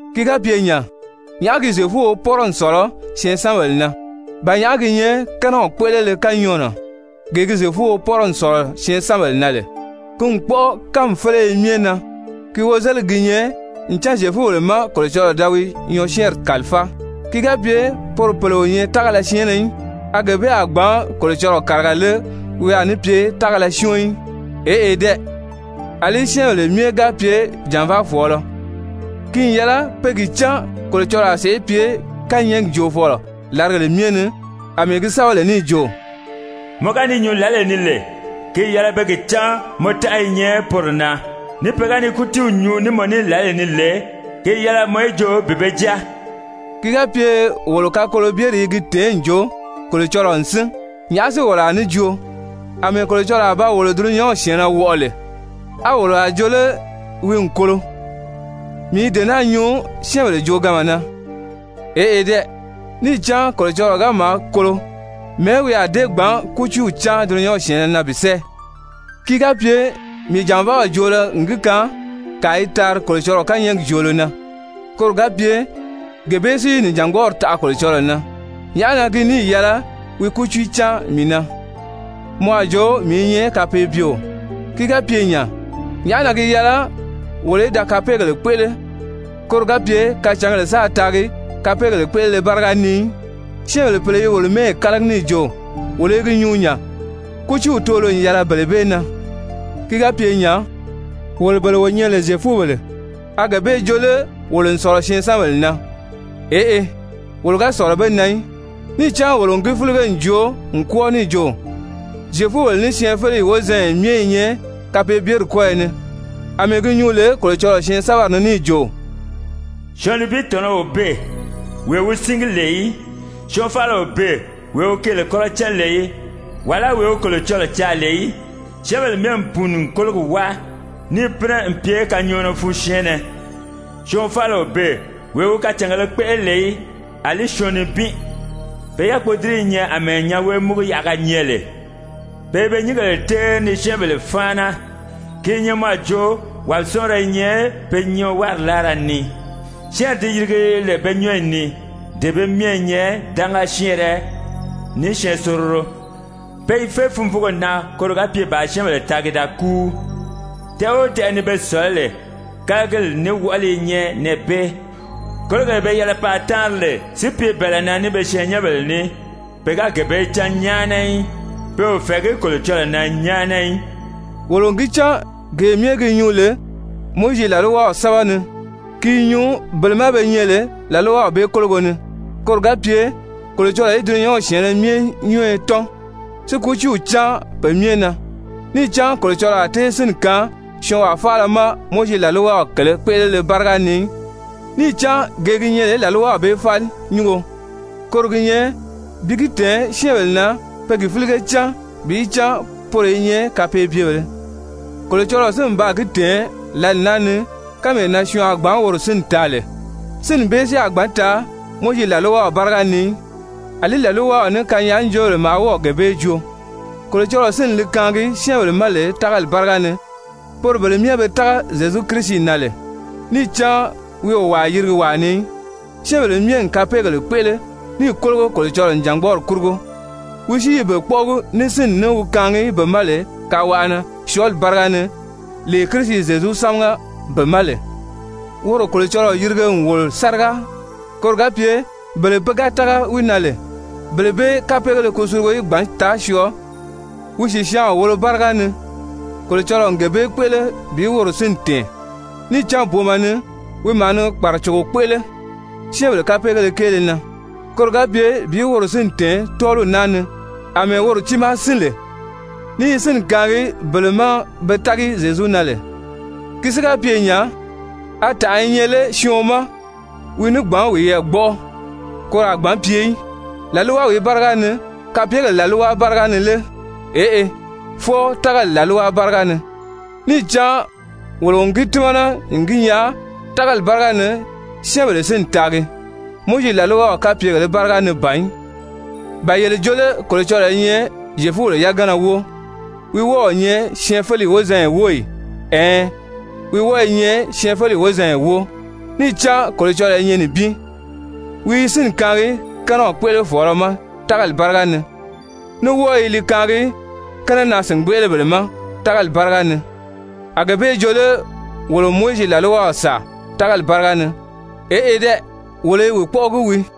Ki ga pye nya, nyàʔá gi Zyefuo pɔ́rɔ n sɔ̀lɔ syɛɛnsanbèle na? Ba nyàʔá gi nyɛ kɛ́nɛw kpéʔelele kanyɔɔnɔ? Gee gi Zyefuo pɔ́rɔ n sɔ̀lɔ syɛɛnsanbèle na lè, ki n kpɔ́ʔɔ kánmi féleye myɛ na. Ki wozeligi gi nyɛ ncan Zyefubèle má Kolocɔlɔɔ da wi nyɔɔsyɛɛnri kàlifáa. Ki ga pye poro pèle o nyɛ tágala syɛɛnnɛ í, a gee bee a gbǎn Kolocɔlɔɔ kàriga lé wi a ní pye tágala syɔ́ɔn í? Eʔe dɛ! Alí syɛ́ɛnbèle myɛ ga pye jànvaafɔɔlɔ, ki n yɛlɛ pe gi cán Kolocɔlɔɔ a sèʔé pye kányɛɛgi joofɔlɔ làrigèle myɛ ni, àmɛɛ gi sɛ́bɛ lè níì jo: «Mɔ ga ni nyuu lǎlee ni lè, ki n yɛlɛ pe gi cán mɔ tánʔa i nyɛ poro na, ní pe ga ni kútiiw nyuu ní mɔ ní lǎlee ni lè, ki n yɛlɛ mɔ í joo bi be jáa.» Ki ga pye wolo kakolobyeri i gi tèé n jo Kolocɔlɔɔ n sín, nyàʔá si wolo a ní joo? Amɛɛ Kolocɔlɔɔ a ba wolo dulunyanw syɛ̀ɛnnɛ wɔʔɔ lè, a wolo a jo lé wi n kolo? (Mii i dee naa nyuu syɛ́ɛnbèle jooganma na.) Eʔe dɛ! Níì cán Kolocɔlɔɔ ga maa kolo, mɛ̀ɛ́ wi a dée gbǎn kútiiw cáan dulunyanw syɛ̀ɛnnɛ na bi sɛ́ɛ? Ki ga pye mii jànvaaw joolo n gi kaan kàa i taari Kolocɔlɔɔ kányɛɛgi joolo na, koro ga pye gee bee si nìjangbɔɔri taʔa Kolocɔlɔɔ na, nyàʔá na ki níì yɛlɛ wi kútiiw cáan mii na, mɔ a jo mii i nyɛ kapeebyeo? Ki ga pye nya, nyàʔá na ki ga yɛlɛ wolo í da kapeegèle kpéʔele koro ga pye kacǎngèle sáā taagi kapeegèle kpéʔelele báriga ni í? Syɛ́ɛnbèle pèle i wolo mɛ́ɛyi kálagi níì jo wolo i gi nyuu nya. Kútiiw toolo n yɛlɛ bele bee na. Ki ga pye nya, wolo bele wo nyɛ lè Zyefubèle, a gee bee joo lé wolo n sɔ̀lɔ syɛɛnsanbèle na? Eʔe, wolo ga sɔ̀lɔ be na í. Níì cán wolo n gi fílige n joo n kwɔ́ɔ níì jo Zyefubèle ní syɛɛnfeleyi wozanya myɛ i nyɛ kapeebyeri kɔ́yɔ ni, àmɛɛ gi nyuu lè Kolocɔlɔɔ syɛɛnsɛbɛri ni níì jo: «Syɔɔn nibin tɔ̀nɔ́ o beè, wee wi síngi lè í. Syɔɔn faala o beè, wee wi keele kɔ́rɔ cán lè í, wàlá wee wi Kolocɔlɔɔ caa lè í. Syɛ́ɛnbèle myɛ n pùuni n kólogi wáa, níì pínɛ n pye kanyɔɔnɔ fun syɛɛnnɛ. Syɔɔn faala o beè, wee wi kacàngēle kpéʔele lè í, àlí syɔɔn nibin. Pe yákpodiriyi i nyɛ àmɛɛ nyanwee-múguyaʔaga nyɛ lè, pe i be nyíngèle téeri ni syɛ́ɛnbèle fáana, ki i nyɛ mɔ a jo wàbisɔɔnrɔ i nyɛ pe nyɔɔwari láara ni. Syɛ́ɛnri di yirigi lè pe nyɔ́ɔyi ni, dee bee myɛ i nyɛ dánga syɛ́ɛnrɛ ní syɛɛnsororo. Pe i fé funvuugo na koro ga pye bàā syɛ́ɛnbèle taagi da kúu, tɛʔɛ o tɛʔɛ ni be sɔ̀lɔ́ lè, kálagili ní wɔʔɔli i nyɛ nɛɛ bee, kólogee be yɛlɛ paa táanri lè, si pye bɛ̀ɛlɛ na ní be syɛɛnnyɛnbèle ní, pe ga gee bee cán nyáana í. Pe o fɛ̀ɛgí Kolocɔlɔɔ na nyáana í.» Wolo n gi cán gee myɛ gi nyuu lè Mowizi làlwaw sɛ́bɛ ni, ki i nyuu bele ma be nyɛ lè làlwaw bee kólogo ni, koro ga pye Kolocɔlɔɔ í dulunyanw syɛ̀ɛnnɛ myɛ nyɔ́ɔyɔ tɔ́n, si kútiiw cáan pe myɛ na. Níì cán Kolocɔlɔɔ a tée sínni kaan syɔɔnwaa faala ma Mowizi làlwaw kèlē kpéʔelele báriga ni í, níì cán gee gi nyɛ lè làlwaw bee fáli nyúngo, koro gi nyɛ bi gi tɛ̀ɛn syɛ́ɛnbèle na pe gi fílige cán bi cán poro i nyɛ kapeebyebèlē. Kolocɔlɔɔ si n baa gi tɛ̀ɛn lǎli naa ni kánmee na syɔɔn a gbǎn woro sínni taa lè, sínni bee si a gbǎn taa Mowizi làlwaw báriga ni í, àlí làlwaw ní kanyaajoobèle maa wɔ́ɔ̀ gee bee joo, Kolocɔlɔɔ sínni li kaangi syɛ́ɛnbèle ma lè tágali báriga ni, poro bele myɛ be tága Zyezu Kirisi na lè. Níì cán wi o wàa yirigi wàa ni í, syɛ́ɛnbèle myɛ n kapeegèle kpéʔele níì kólogo Kolocɔlɔɔ nìjangbɔɔri kurugo. Wi si i be kpɔ́ʔɔgi ní sínni ní wi kaangi be ma lè kawaʔa na syɔɔli báriga ni lee Kirisi Zyezu sámaga be ma lè. Woro Kolocɔlɔɔ yirige n wòlo sáriga, koro ga pye bele pe ga tága wi na lè, bele bee kapeegéle kusulugo í gbǎn taa syɔɔ wi sìsyaanw wolo báriga ni, Kolocɔlɔɔ n gee bee kpéʔele bi woro sínni tɛ̀ɛn. Níì cán booma ni wi maa ni kpàracogo kpéʔele syɛ́ɛnbèle kapeegéle kéele na, koro ga pye bi woro sínni tɛ̀ɛn tɔ́ɔliw naa ni àmɛɛ woro tiimaa sín lè ní i sínni kaangi bele ma be tági Zyezu na lè. Ki si ga pye nya, a tànʔa i nyɛ lé syɔɔn ma wi ní gbǎn wiyɛɛ gbɔ́ʔɔ? Koro a gbǎn pye í. Làlwawìí báriga ni? Kapyegèle làlwa báriga ni lé? Eʔe, fwɔɔ tágali làlwa báriga ni. Níì cán wolo n gi tímana n gi nyaa tágali báriga ni syɛ́ɛnbèle sínni taagi, Mowizi làlwaw kapyegèlē báriga ni ban í. Ba yele joo lé Kolocɔlɔɔ i nyɛ Zyefubèle yagana wóo? Wi wɔ́ɔ o nyɛ syɛɛnfeleyi wozanya wóo ì? Ɛɛn, wi wɔ́ɔ i nyɛ syɛɛnfeleyi wozanya wóo. Níì cán Kolocɔlɔɔ i nyɛ nibin, wi i sínni kaangi kɛ́nɛw kpéʔelefɔɔlɔ ma tágali báriga ni, ní wɔ́ɔ i li kaangi kɛ́nɛnaa-sìngbeʔelebèle ma tágali báriga ni. A gee bee jo lé wolo n Mowizi làlwaw sàa tágali báriga ni? Eʔe dɛ! Wolo i wi kpɔ́ʔɔgi wii.